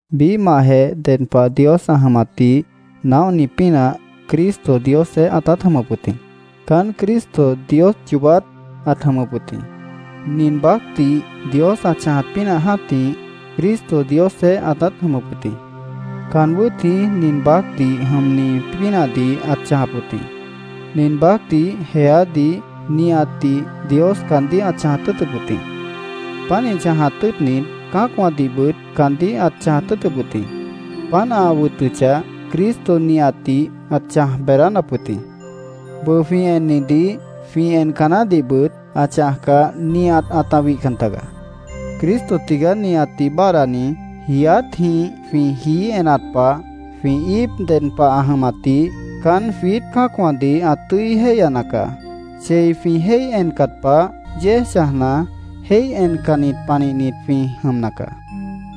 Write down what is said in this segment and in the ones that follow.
Biíhmahjeh ded pah Dios ã jʉmatdih naóhni pínah, Cristo, Diosjeéh ãtát jʉmʉp wʉt jĩ. Caán Cristo Dios yoobát ãt jʉmʉp wʉt jĩ. Nin baácdih Dios ã chãjat pínah jã́tih, Cristo Diosjeéh ãtát jʉmʉp wʉt jĩ. Caan wʉ́t jĩí nin baácdih jʉmni pínahdih ãt chãjap wʉt jĩ. Nin baácdih, jeádih, nihatdih Dios caandíh ãt chãjat tʉ́ʉtʉp wʉt jĩ. Pánih chãjat tʉ́ʉtnit, cã́acwãdihbʉt caandíh ãt chãjat tʉ́ʉtʉp wʉt jĩ. Páant ã wʉtʉchah, Cristo nihatdih ãt chãj beedánap wʉt jĩ. Bʉʉ jwĩ ennidih, jwĩ enca naáhdihbʉt ã chãjcah, nihat ãta wihcan tagaá. Cristo tigaá nihatdih báadhdani. Jiiátjĩh jwĩ jií enat pah, jwĩ íip ded pah ã jʉmatdih caán jwiít cã́acwãdih ã tʉ́i jéihyana caá. Chei jwĩ jéih encat pah, yéej chãjna, jéih encannit panihnit jwĩ jʉmna caá.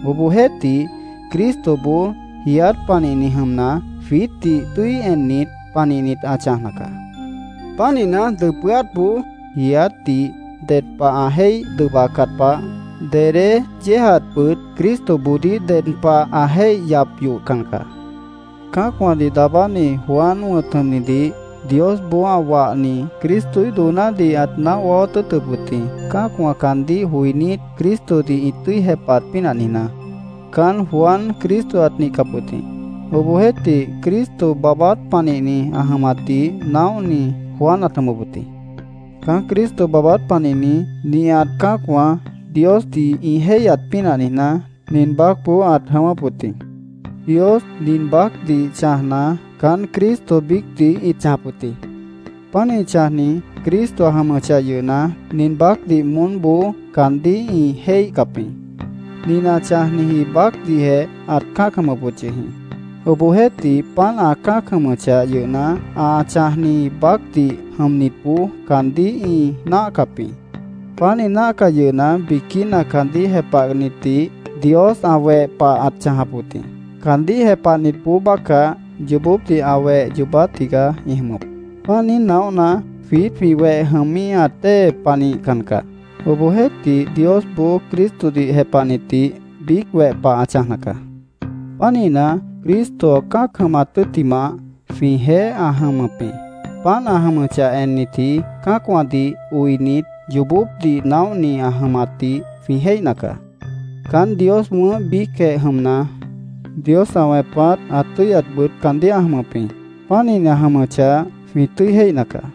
Obohjeéhtih, Cristoboó jiiát panihni jʉmna, jwiítdih tʉ́i ennit panihnit ã chãjna caá. Pánihna, dʉpʉ́átboó jiiátdih ded pah ã jéih dʉbacat pah, dedé yéejatbʉt Cristoboodíh ded pah ã jéih yap yohcan caá. Cã́acwãdih daabáni Juan wʉ̃t jʉmnidih Diosboó ã wahni Cristoíh doonádih ãt naóh waáwát tʉ́ʉtʉp wʉt jĩ, cã́acwã caandíh joinít, Cristodih ĩ tʉ́i jepahat pínah niijná. Caán Juan Cristo ãt nihcap wʉt jĩ. Obohjeéhtih, Cristo baabát panihni ã jʉmatdih naóhni Juan ãt jʉmʉp wʉt jĩ. Caán Cristo baabát panihni, nihat cã́acwã Diosdih ĩ jéihyat pínah niijná, nin baácboó ãt jʉ̃ʉ́wʉ́p wʉt jĩ. Dios nin baácdih chãjna, caán Cristo biícdih ĩt chãjap wʉt jĩ. Pánih chãjni Cristo ã jʉmʉchah yʉhna, nin baácdih moónboó caandíh ĩ jéihcap jĩ. Nin ã chãjniji baácdihjeh ãt cã́ac jʉmʉp wʉt yʉh jĩ. Obohjeéhtih, páant ã cã́ac jʉmʉchah yʉhna, ã chãjni baácdih jʉmnitboó caandíh ĩ náahcap jĩ. Páant ĩ náahcah yʉhna, biquína caandíh jepahnitdih Dios ã weh pah ãt chãjap wʉt jĩ. Caandíh jepahnitboó bácah, yoobópdih ã weh yoobát tigaá ĩ jʉmʉp. Páant niíj naóhna, jwiít jwĩ weh jʉmíhat dée panihcan caá. Obohjeéhtih, Diosboó Cristodih jepahnitdih biíc weh pah ã chãjna caá. Pánihna, Cristo ã cã́ac jʉmat tʉ́ttimah, jwĩjeéh ã jʉmʉp jĩ. Páant ã jʉmʉchah ennitji, cã́acwãdih oinit, yoobópdih naóhni ã jʉmatdih jwĩ jéihna caá. Caán Dios wʉ̃ʉ́h biícjeh jʉmna, Dios ã wẽpat ã tʉ́yatbʉt caandíh ã jʉmʉp jĩ. Pánihni ã jʉmʉchah, jwĩ tʉ́i jéihna caá.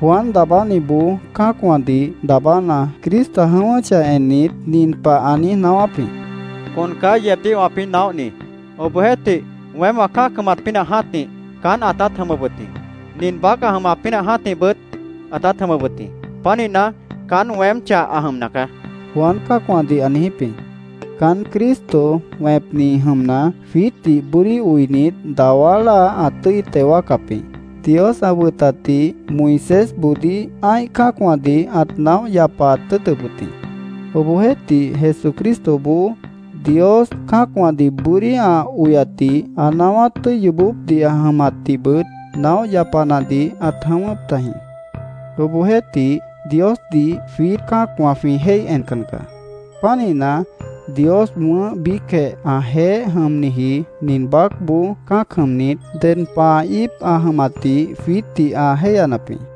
Juan Daabániboó cã́acwãdih daabána, Cristo ã jʉ̃ʉ́wʉ́chah ennit, nin pah ã niíj naáwáp jĩ: “Con caá yeebdíh wãpĩ́ naóhni. Obohjeéhtih, weém wã cã́ac jʉmat pínah jã́tih, caán ãtát jʉmʉp wʉt jĩ. Nin baác ã jʉmat pínah jã́tihbʉt ãtát jʉmʉp wʉt jĩ. Pánihna, caán weem cháh ã jʉmna caá”, Juan cã́acwãdih ã niijíp jĩ. Caán Cristo wẽpni jʉmna, jwiítdih bʉ́dí oinit, dawá láa ã tʉ́i teo wáacap jĩ. Dios ã wʉtatdih Moisésboodíh ã́ih cã́acwãdih ãt naóh yapaat tʉ́ʉtʉp wʉt jĩ. Obohjeéhtih, Jesucristoboó Dios cã́acwãdih bʉ́dí ã oyatdih, ã naáwát tʉ́i yoobópdih ã jʉmatdihbʉt naóh yapanadih ãt jʉ̃ʉ́wʉ́p tajĩ. Obohjeéhtih, Diosdih jwiít cã́acwã jwĩ jéih encan caá. Pánihna, Dios wʉ̃ʉ́h biícjeh ãjeéh jʉmniji nin baácboó cã́ac jʉmnit, ded pah ã íip ã jʉmatdih jwiítdih ã jéihyanap jĩ.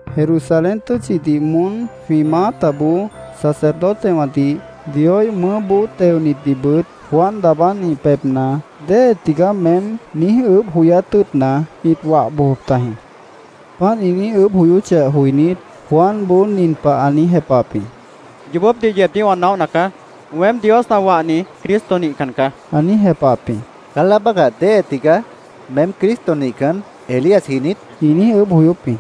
Jerusalén tʉ́tchidih moón jwĩ maátaboó sacerdotewãdih, Dioíh mʉʉ́boó teonitdihbʉt Juan Daabáni pebhna “¿Déhe tigaá meém?” niíj ʉʉ́bh joyát tʉ́ʉtna, ĩt wah bojop tajĩ. Páant ĩ niíj ʉʉ́bh joyóchah joinít, Juanboó nin pah ã niíj jepahap jĩ: —Yoobópdih yeebdíh wã naóhna caá. Weém, Dios ã wahni Cristo nihcan caá, ã niíj jepahap jĩ. —¿Caán láa bácah déhe tigaá? ¿Meém Cristo nihcan, Elíasji niít? ĩ niíj ʉʉ́bh joyóp jĩ.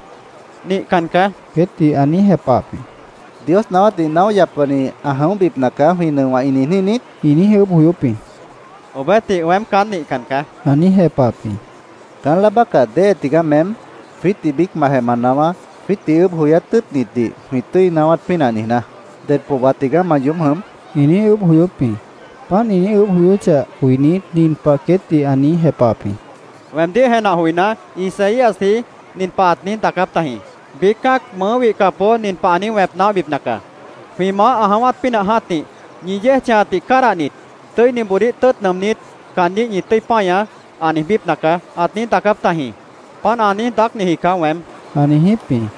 —Nihcan caá, queétdih ã niíj jepahap jĩ. —¿‘Dios naáwátdih naóh yapani ã jʉ̃óhbipna caá’, jwĩ nʉowã ĩ niijní niít? ĩ niíj ʉʉ́bh joyóp jĩ. —Obohjeéhtih, weém caán nihcan caá, ã niíj jepahap jĩ. —¿Caán láa bácah déhe tigaá meém? Jwiítdih biícmantjeh ma naáwá, jwiítdih ʉʉ́bh joyát tʉ́ʉtnitdih jwĩ tʉ́i naáwát pínah niijná. ¿Ded pohba tigaá ma yoób jʉm? ĩ niíj ʉʉ́bh joyóp jĩ. Páant ĩ niíj ʉʉ́bh joyóchah joinít, nin pah queétdih ã niíj jepahap jĩ: —Weemdíh jenah joiná, Isaíasji nin pah ãt niíj daacáp tajĩ: ‘Biíc cã́ac mʉʉ́ wihcapboó nin pah ã niíj wẽp naóhbipna caá: “Jwĩ Maáh ã jʉ̃ʉ́wát pínah jã́tih ñi yéej chãjatdih cádahnit, tʉ́iniboodíh tʉ́ʉt nʉʉmnít, caandíh ñi tʉ́i páñaá”, ã niijbípna caá’, ãt niíj daacáp tajĩ. Páant ã niíj daácniji caá weém, ã niijíp jĩ.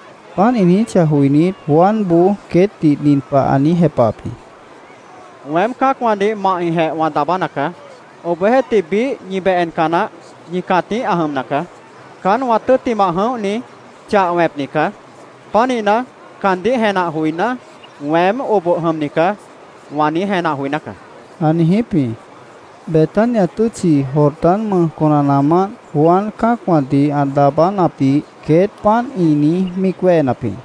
Páant ĩ niijíchah joinít, Juanboó queétdih nin pah ã niíj jepahap jĩ: —Weém cã́acwãdih mahjĩhjeh wã daabána caá. Obohjeéhtih, biíh ñi beh enca naáh ñi cãtíh ã jʉmna caá. Caán wã tʉ́ttimah jʉ̃óhni chah wẽpni caá. Pánihna, caandíh jenah joiná, ‘Weém oboh jʉmni caá’, wã niíj jenah joiná caá, ã niijíp jĩ. Betania tʉ́tchi Jordán mʉj conanaamánt Juan cã́acwãdih ã daabánapdih queét páant ĩ niíj míic wéhenap jĩ.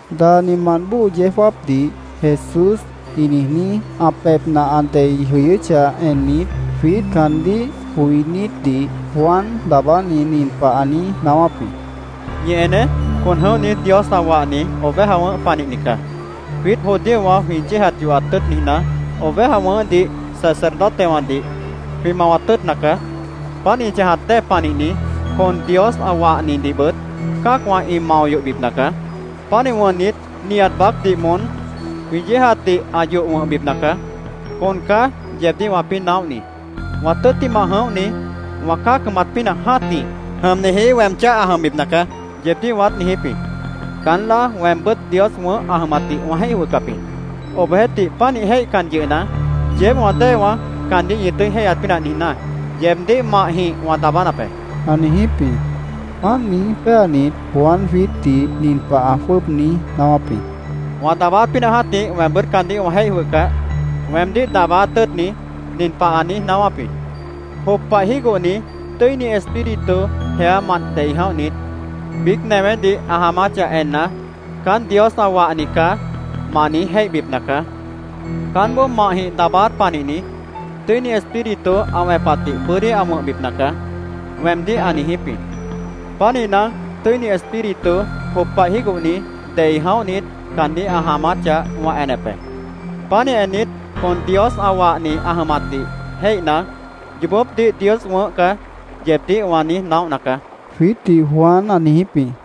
Daanimant bóo yeó jáapdih Jesús ĩ niijní ã pebhna ã dei jʉyʉ́chah ennit, jwiít caandíh joinítdih Juan Daabáni nin pah ã niíj naáwáp jĩ: “Ñi eneé. Con jʉ̃óhni Dios ã wahni oveja wʉ̃ʉ́h panihni caá. Jwiít judíowã jwĩ yéejat yohat tʉ́ʉt niijná, oveja wʉ̃ʉ́hdih sacerdotewãdih jwĩ mawat tʉ́ʉtna caá. Páant ĩ chãjat dée panihni, con Dios ã wahnidihbʉt cã́acwã ĩ mao yohbipna caá. Pánih wʉnnit, nihat baácdih moón jwĩ yéejatdih ã yoh wʉ̃hbipna caá. Con caá yeebdíh wãpĩ́ naóhni. ‘Wã tʉ́ttimah jʉ̃óhni wã cã́ac jʉmat pínah jã́tih jʉmniji weem cháh ã jʉmbipna caá’, yeebdíh wãát niijíp jĩ. Caán láa, weembʉ́t Dios wʉ̃ʉ́h ã jʉmatdih wã jéih jwʉhcap jĩ. Obohjeéhtih, panih jéihcan yʉhna, yeéb wã déewã caandíh ñi tʉ́i jéihyat pínah niijná, yeebdíh mahjĩh wã daabánap be”, ã niijíp jĩ. Páant niíj péanit, Juan jwiítdih nin pah ã jwʉ́ʉb niíj naáwáp jĩ: “Wã daabáát pínah jã́tih weembʉ́t caandíh wã jéih jwʉhcah, weemdíh daabáát tʉ́ʉtni nin pah ã niíj naáwáp jĩ: ‘Jop pah jígohni Tʉ́ini Espíritu jeámant dei jʉ̃óhnit, biíc newédih ã jaamáchah enna, “Caán Dios ã wahni caá”, ma niíj jéihbipna caá. Caánboó mahjĩh daabáát panihni Tʉ́ini Espíritu ã wẽpatdih bʉ́dí ã wʉ̃hbipna caá’, weemdíh ã niijíp jĩ. Pánihna, Tʉ́ini Espíritu, jop pah jígohni, dei jʉ̃óhnit, caandíh ã jaamáchah, wã enep be. Pánih ennit, con Dios ã wahni ã jʉmatdih jéihna, ‘Yoobópdih Dios wʉ̃ʉ́h caá’, yeebdíh wã niíj naóhna caá”, jwiítdih Juan ã niijíp jĩ.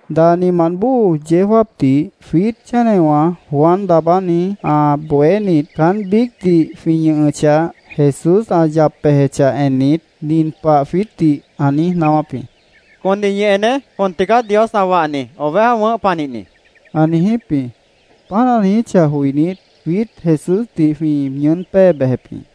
Daanimant bóo yeó jáapdih, jwiít chénewã Juan Daabáni ã bohénit, caán biícdih jwĩ ñʉhʉchah, Jesús ã yap bejechah ennit, nin pah jwiítdih ã niíj naáwáp jĩ: —Condih ñi eneé. Con tigaá Dios ã wahni oveja wʉ̃ʉ́h panihni, ã niijíp jĩ. Páant ã niijíchah joinít, jwiít Jesúsdih jwĩ ñʉʉ́n pée bejep jĩ.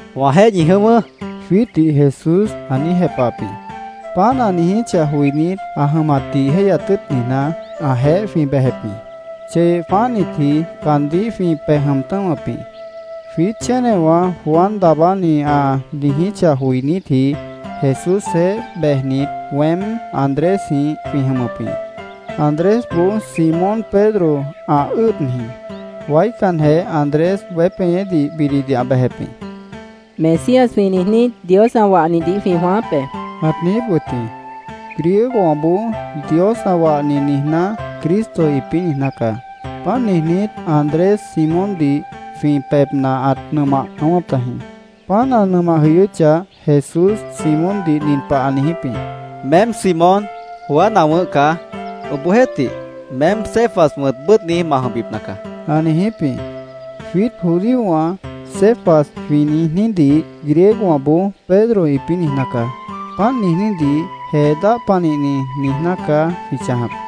—Wãjeéh ñi jʉ̃ʉ́wʉ́, jwiítdih Jesús ã niíj jepahap jĩ. Páant ã niijíchah joinít, ã jʉmatdih jéihyat tʉ́ʉt niijná, ãjeéh jwĩ bejep jĩ. Cheyeh jwãáhnitji caandíh jwĩ pej jʉm tʉ̃́wʉp jĩ. Jwiít chénewã Juan Daabáni ã niijíchah joinítji Jesúsjeéh bejnit, weém Andrésjĩh jwĩ jʉmʉp jĩ. Andrésboó Simón Pedro ã ʉ́ʉd jĩ. Waícanjeh Andrés weép jeñédih bididih ã bejep jĩ. —Mesías jwĩ niijní, Dios ã wahnidih jwĩ jwãááp be, ãt niijíp wʉt jĩ. Griegowãboó Dios ã wahni niijná, ‘Cristo’ ĩpĩ́ niijná caá. Páant niijnít, Andrés Simóndih jwĩ pebhna ãt nʉmah jʉ̃ʉ́wʉ́p tajĩ. Páant ã nʉmah jʉyʉ́chah, Jesús Simóndih nin pah ã niijíp jĩ: —Meém Simón, Juan ã wʉ̃ʉ́h caá. Obohjeéhtih, meém Cefas wʉ̃t bʉ́ʉdhni ma jʉmbipna caá, ã niijíp jĩ. Jwiít judíowã “Cefas” jwĩ niijnídih griegowãboó “Pedro”, ĩpĩ́ niijná caá. Páant niijnídih “Jee dáh panihni”, niijná caá jwĩ chãjap.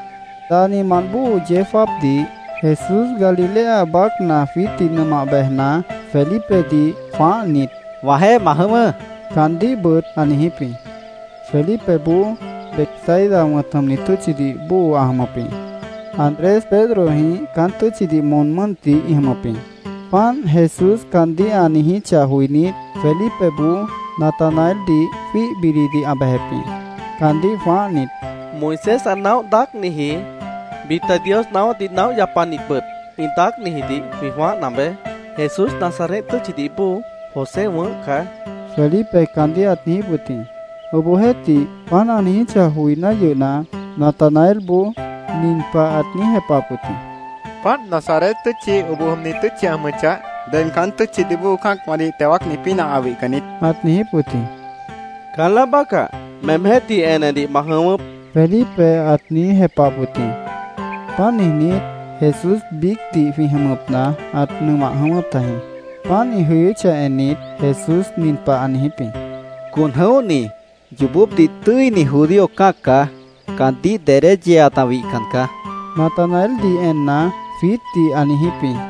Daanimant bóo yeó jáapdih Jesús Galilea baácna jwiítdih nʉmah bejna, Felipedih jwãáhnit: —Wãjeéh ma jʉ̃ʉ́wʉ́, caandíhbʉt ã niijíp jĩ. Felipeboó Betsaida wʉ̃t jʉmni tʉ́tchidih bóo ã jʉmʉp jĩ. Andrés Pedrojĩh caán tʉ́tchidih moon mʉ́ntih ĩ jʉmʉp jĩ. Páant Jesús caandíh ã niijíchah joinít, Felipeboó Natanaeldih jwíih bididih ã bejep jĩ. Caandíh jwãáhnit, —Moisés ã naóh daácniji, bita Dios naáwátdih naóh yapanitbʉt ĩ daácnijidih jwĩ jwãáhna beé. Jesús Nazaret tʉ́tchidih bóo José wʉ̃ʉ́h caá, Felipe caandíh ãt niijíp wʉt jĩ. Obohjeéhtih, páant ã niijíchah joiná yʉhna, Natanaelboó nin pah ãt niíj jepahap wʉt jĩ: —Páant, Nazaret tʉ́tchi oboh jʉmni tʉ́tchi ã jʉmʉchah, ded caán tʉ́tchidih bóo cã́acwãdih teo wáacni pínah ã wihcan niít, ãt niijíp wʉt jĩ. —Caán láa bácah, meemjéh tih enedih ma jʉ̃ʉ́wʉ́p, Felipe ãt niíj jepahap wʉt jĩ. Páant niijnít, Jesús biícdih jwĩ jʉmʉpna ãt nʉmah jʉ̃ʉ́wʉ́p tajĩ. Páant, ĩ jʉ̃ʉ́wʉ́chah ennit, Jesús nin pah ã niijíp jĩ: —Con jʉ̃óhni, yoobópdih tʉ́ini judío cã́ac caá. Caandíh dedé yeeat ã wihcan caá, Natanaeldih enna, jwiítdih ã niijíp jĩ.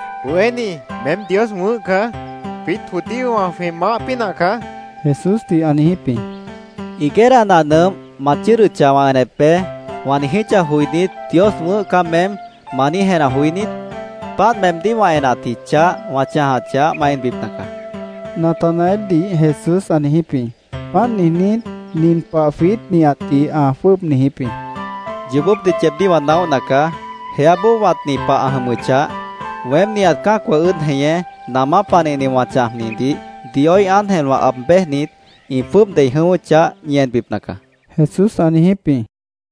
—Bohéní, meém Dios wʉ̃ʉ́h caá. Jwiít judíowã jwĩ Maáh pínah caá, Jesúsdih ã niijíp jĩ. —‘Higuera nah nʉmp ma chʉ́ʉdʉchah, wã enep be’, wã niijíchah joinít, ‘Dios wʉ̃ʉ́h caá meém’, ¿ma niíj jenah joí niít? Páant meemdíh wã enatji chah wã chãjachah, ma enbipna caá, Natanaeldih Jesús ã niijíp jĩ. Páant niijnít, nin pah jwiít nihatdih ã jwʉ́ʉb niijíp jĩ: —Yoobópdih yeebdíh wã naóhna caá. Jeáboó wãtni pah ã jʉmʉchah, weém nihat cã́acwã ʉ́ʉd jeñé namá panihni wã chãjnidih Dioíh ángelwã aab béjnit, ĩ jwʉ́ʉb dei jʉ̃ʉ́wʉ́chah, ñi enbipna caá, Jesús ã niijíp jĩ.